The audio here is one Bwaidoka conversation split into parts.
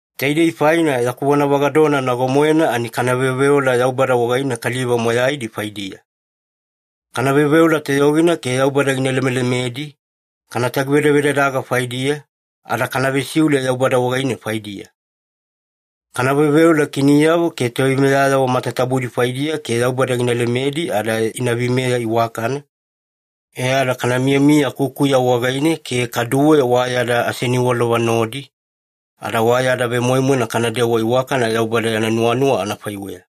Taidei faina yaku vonavagadona nago-moena ani kana veoveola Yaubada wagaine kaliva moyaidi faidiya. Kana veoveola toyogina ke Yaubada gina lemelemedi, kana tagivedadaga faidiya, ada kana vesiule Yaubada wagaine faidiya. Kana veoveola kiniyavo ke toveimeyayavo matatabudi faidiya ke Yaubada gina lemedi ada ina veimeya iwakana, e ada kana miyamiya kukuya wagaine ke kaduwe wa yada aseniwalova nodi, ada wa yada vemoimoina kanadewa iwakana Yaubada yana nuwanuwa anafaiweya.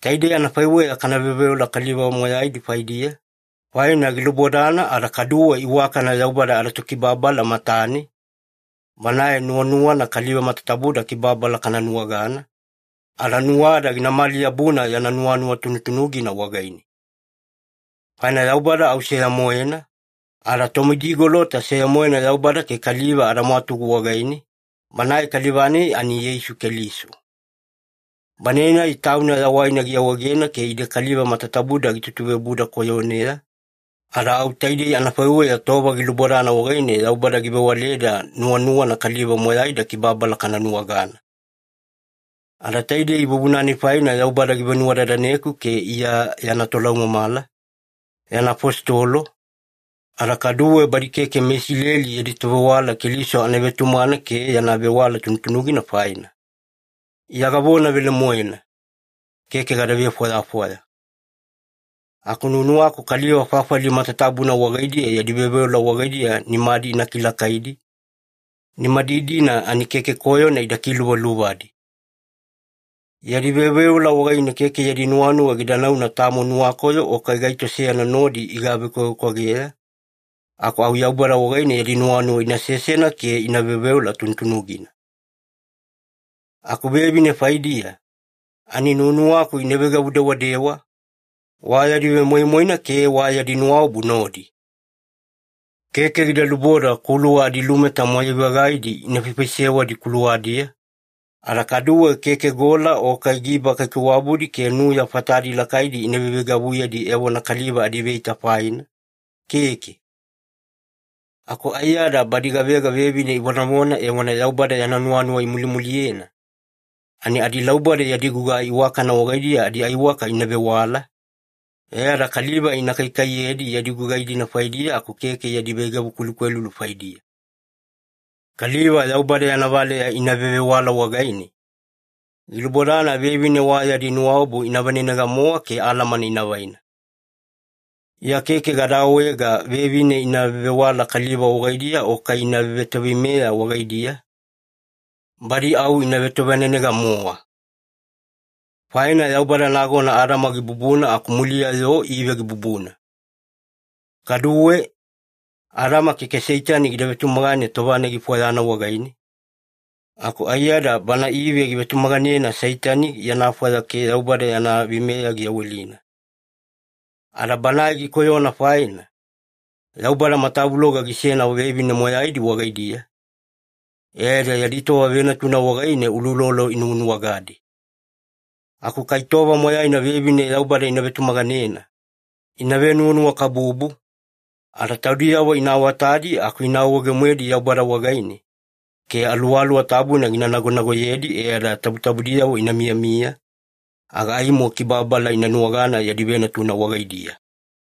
Taidei anafaiweya kana veoveola kaliva moyaidi faidiya, faina gilubodana ada kaduwe iwakana Yaubada adaTokibababala matane, Banae nuwanuwana kaliva matatabuda kibababala kana nuwagana, ada nuwada ginamali-yabuna yana nuwanuwa tunutunugina wagaine. Faina Yaubada au seya-moena, ada Tomidigolota seya-moena Yaubada ke kaliva adamwatugu wagaine, Banae kaliva-nai ani Yeisu Keliso. Banae-nai Tauna yawaina giawaegena ke ide kaliva matatabuda gitutuveobuda koyoneya, ada au taidei anafaiweya tova gilubodana wagaine Yaubada givewaleda nuwanuwana kaliva moyaida kibababala kana nuwagana. Ada taidei vuvuna-nai faina Yaubada givenuwadadaneku ke Iya yana tolaumamala, yana afositolo, ada kaduwe badi keke meIsileli yadi tovewala Keliso anavetumagana ke yana vewala tunutunugina faina. Iya gavona velemoena. Keke gada vefwayafwaya. Aku nuwanuwaku kaliva fafali matatabuna wagaidiya yadi veoveola wagaidiya nimadi ina kilakaidi, nimadi-dina ani keke koyona ida kiluvaluvadi. Yadi veoveola wagaine keke yadi nuwanuwa gida nauna tamo nuwakoyo o kai gaito seyana nodi igavekwavekwageya, aku au Yaubada wagaine yadi nuwanuwa ina sesena ke ina veoveola tunutunugina. Aku vevine faidiya, ani nuwanuwaku ina veigavu-dewadewa, wa yadi vemoimoina ke wa yadi nuwaobu nodi. Keke gida luboda kuluwa adilumeta moyai-vagaidi ina faifaisewadi kuluwadiya, ada kaduwe keke gola o kai giba kaikaiwabudi ke nuya fatadi lakaidi ina veiveigavuyedi evona kaliva adiveita faina, keke. Aku aiyada badi gavega vevine ivonavona evona Yaubada yana nuwanuwa imulimuliyena, ani adilauboda yadi gugai iwakana wagaidiya adiaiwaka ina vewala, e ada kaliva ina kaikaiyedi yadi gugai-dina faidiya aku keke yadi veigavu kwelukwelulu faidiya. Kaliva Yaubada yana valeya ina vevewala wagaine, gilubodana vevine wa yadi nuwaobu ina vanenega-mowa ke alamana ina vaina. Iya keke gada awaega vevine ina vevewala kaliva wagaidiya o kai ina vevetoveimeya wagaidiya, badi au ina vetovanenega-mowa. Faina Yaubada nagona Adama gibubuna aku muliya-yo Ive gibubuna. Kaduwe, Adama keke Seitani gida vetumagane tova-nai gifwayana wagaine, aku aiyada bana Ive givetumaganena Seitani yana fwaya ke Yaubada yana veimeya giyawelina. Ada banae gikoyona faina, Yaubada matavuloga gisena vevine moyaidi wagaidiya, e ada yadi tova venatuna wagaine uloulolo inuwanuwagadi. Aku kai tova moyaina vevine Yaubada ina vetumaganena, ina venuwanuwakabubu, ada taudiyavo ina awatadi aku ina awaawaege-moedi Yaubada wagaine, ke Aluwaluwa Tabuna gina nagonagoyedi e ada tabutabudiyavo ina miyamiya, aga aimo kibababala ina nuwagana yadi venatuna wagaidiya.